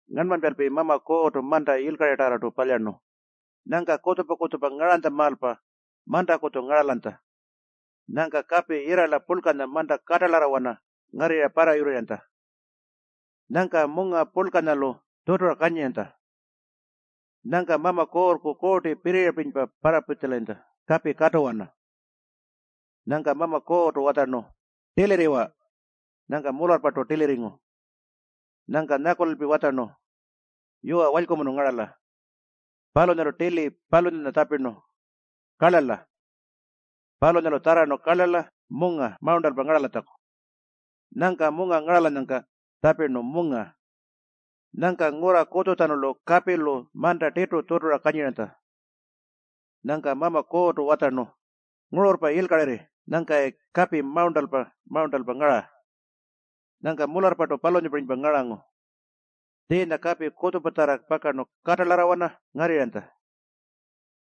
Ngarnmanypalpi Mama Kuurrtu manta yilkaritarrartu palyarnu. Nyangka kutjupa-kutjupa ngaranytjamaalpa mantakutju ngaralanytja. Nyangka kapi yirrala purlkanya manta katalarrawana ngarrirra parrayurrirranytja. Nyangka munga purlkanyalu tjutura kanyiranytja. Nyangka Mama Kuurrku Kuurti pirriyapirinypa parrapitjalayintja kapi katuwana. Nyangka Mama Kuurrtu watjarnu, “Tilirriwa.” Nyangka mularrpartu tilirringu. Nyangka nyakulalpi watjarnu, “Yuwa, walykumunu ngarala.” Palunyalu tili palunyanya tjapirnu, “Karlarla”. Palunyalu tjarrarnu karlarla, munga mawurntalpa ngaralatjaku. Nyangka munga ngaralanyangka tjapirnu, “Munga”. Nyangka ngurra kutjutjanulu kapilu manta tirtu tjutura kanyiranytja. Nyangka Mama Kuurrtu watjarnu, “Ngururrpa yilkarirri nyangkayi kapi mawurntalpa-mawurntalpa ngara.” Nyangka mularrpartu palunyapirinypa ngarangu. Tjiinya kapi kutjupatjarra pakarnu katalarrawana ngarrirranytja.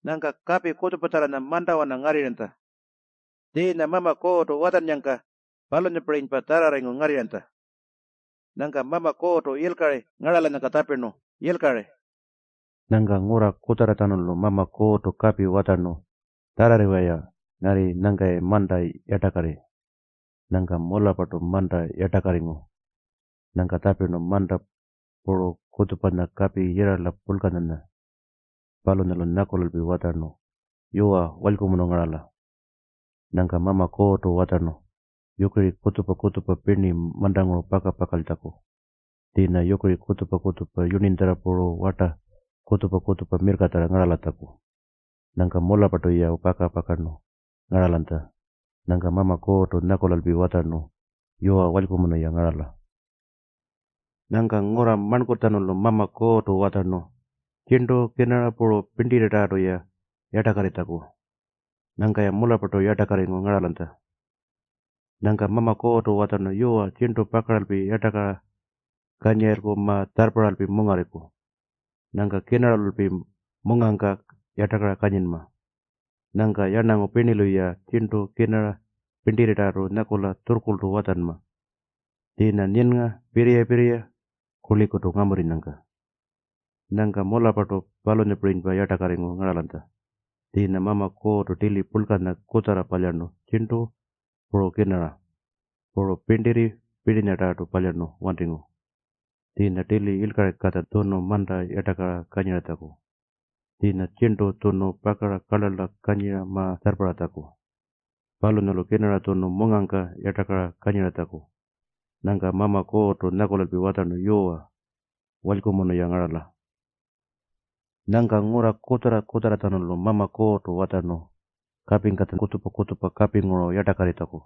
Nyangka kapi kutjupatjarranya mantawana ngarrirranytja. Tjiinya Mama Kuurrtu watjannyangka palunyapirinypa tjarrarringu ngarrirranytja. Nyangka Mama Kuurrtu yilkari ngaralanyangka tjapirnu, “Yilkari.” Nyangka ngurra kutjarratjanulu Mama Kuurrtu kapi watjarnu, “Tjarrarriwa-ya ngarri nyangkayi manta yartakarri.” Nyangka mularrpartu manta yartakarringu. Nyangka tjapirnu, “Manta” puru kutjupanya “Kapi Yirrala Purlkanya”. Palunyalu nyakulalpi watjarnu, “Yuwa, walykumunu ngarala.” Nyangka Mama Kuurrtu watjarnu yukiri kutjupa-kutjupa pirni mantanguru paka-pakaltjaku tjiinya yukiri kutjupa-kutjupa yurninytjarra puru warta kutjupa-kutjupa mirrkatjarra ngaralatjaku. Nyangka mularrpartu-ya paka-pakarnu ngaralanytja. Nyangka Mama Kuurrtu nyakulalpi watjarnu, “Yuwa, walykumunu-ya ngarala.” Nyangka ngurra marnkurrtjanulu Mama Kuurrtu watjarnu tjirntu, kirnara puru pirntirritarrartu-ya yartakarritjaku. Nyangka-ya mularrpartu yartakarringu ngaralanytja. Nyangka Mama Kuurrtu watjarnu, “Yuwa, tjirntu pakaralpi yartakara kanyirayilku ma-tjarrparralpi mungarriku. Nyangka kirnaralulpi mungangka yartakara kanyinma. Nyangka yarnangu pirnilu-ya tjirntu, kirnara, pirntirritarrartu nyakula tjurrkurltu watjanma tjiinya nyinnga, pirriya-pirriya, kurlikutu ngamurrinyangka.” Nyangka mularrpartu palunyapirinypa yartakarringu ngaralanytja. Tjiinya Mama Kuurrtu tili purlkanya kutjarra palyarnu tjirntu, puru kirnara. Puru pirntirritarrartu palyarnu wantingu. Tjiinya tili yilkaringkatja tjunu manta yartakara kanyiratjaku. Tjiinya tjirntu tjunu pakara karlarlara kanyira ma-tjarrparratjaku. Palunyalu kirnara tjunu mungangka yartakara kanyiratjaku. Nyangka Mama Kuurrtu nyakulalpi watjarnu, “Yuwa, walykumunu-ya ngarala.” Nyangka ngurra kutjarra-kutjarratjanulu Mama Kuurrtu watjarnu kapingkatja kutjupa-kutjupa kapinguru yartakarritjaku.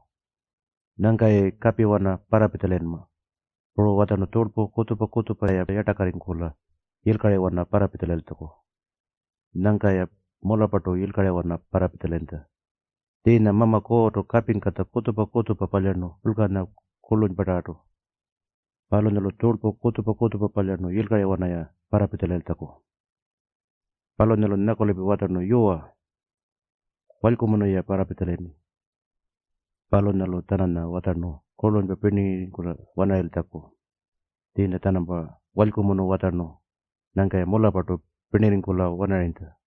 Nyangka-yayi kapiwana parrapitjalayinma. Puru watjarnu tjurlpu kutjupa-kutjupa-ya yartakarringkula yilkariwana parrapitjalayiltjaku. Nyangka-ya mularrpartu yilkariwana parrapitjalayintja. Tjiinya Mama Kuurrtu kapingkatja kutjupa-kutjupa palyarnu purlkanya, kurlunypatarrartu. Palunyalu tjurlpu kutjupa-kutjupa palyarnu yilkariwana-ya parrapitjalayiltjaku. Palunyalu nyakulalpi watjarnu, “Yuwa, walykumunu-ya parrapitjalayirni.” Palunyalu-tjananya watjarnu kurlunypa pirnitjarrarringkula-wanarayiltjaku. Tjiinya-tjanampa walykumunu watjarnu. Nyangka-ya mularrpartu pirnirringkula-wanarayintja.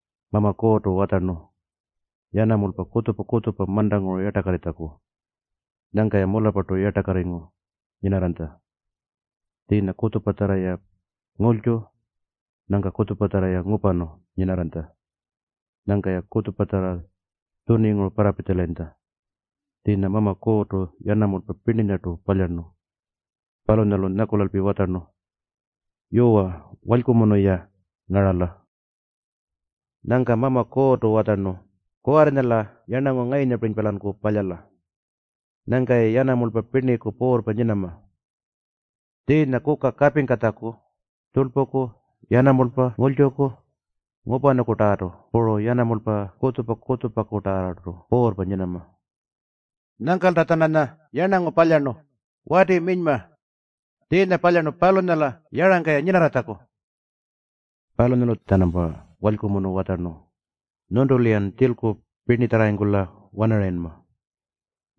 Mama Kuurrtu watjarnu yanamulpa kutjupa-kutjupa mantanguru yartakarritjaku. Nyangka-ya mularrpartu yartakarringu nyinarranytja. Tjiinya kutjupatjarra-ya ngulytju, nyangka kutjupatjarra-ya ngupanu nyinarranytja. Nyangka-ya kutjupatjarra tjuninguru parrapitjalayintja. Tjiinya Mama Kuurrtu yanamulpa pirninyartu palyarnu. Palunyalu nyakulalpi watjarnu, “Yuwa, walykumunu-ya ngarala.” Nyangka Mama Kuurrtu watjarnu, “Kuwarrinya-la yarnangu ngayunyapirinypa-lanku palyala. Nyangka-yayi yanamulpa pirniku puurrpa nyinama. Tjiinya kuka kapingkatjaku, tjurlpuku, yanamulpa ngulytjuku, ngupanukutarrartu puru yanamulpa kutjupa-kutjupakutarrartu puurrpa nyinama.” Nyangkalta-tjananya yarnangu palyarnu, wati minyma. Tjiinya palyarnu palunyala yarangka-ya nyinarratjaku. Palunyalu-tjanampa walykumunu watjarnu, “Nyuntulu-yan tjilku pirnitjarrarringkula-wanarayinma.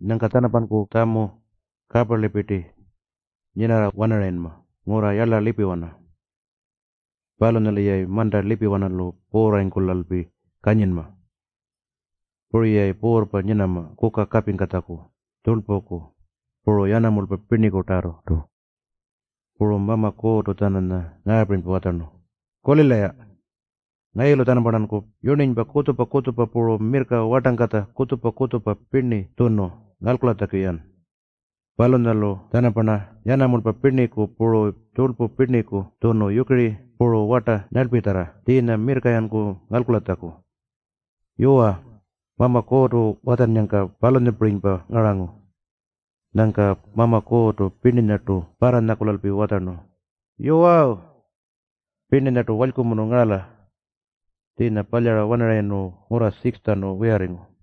Nyangka-tjanampanku tjamu kaparlipirti nyinarra-wanarayinma ngurra yarla lipiwana. Palunyalu-yayi manta lipiwanalu puurrarringkulalpi kanyinma. Puru-yayi puurrpa nyinama kuka kapingkatjaku, tjurlpuku, puru yanamulpa pirnikutarrartu.” Puru Mama Kuurrtu-tjananya ngaapirinypa watjarnu, “Kulila-ya. Ngayulu-tjanamparnanku yurninypa kutjupa-kutjupa puru mirrka wartangkatja kutjupa-kutjupa pirni tjunu ngalkulatjaku-yan. Palunyalu-tjanamparna yanamulpa pirniku puru tjurlpu pirniku tjunu yukiri puru warta nyarlpitjarra tjiinya mirrka-yanku ngalkulatjaku.” Yuwa, Mama Kuurrtu watjannyangka palunyapirinypa ngarangu. Nyangka Mama Kuurrtu pirninyartu parranyakulalpi watjarnu, “Yuwawu! Pirninyartu walykumunu ngarala.” Tjiinya palyara-wanarayirnu ngurra 6-tjanu wiyarringu.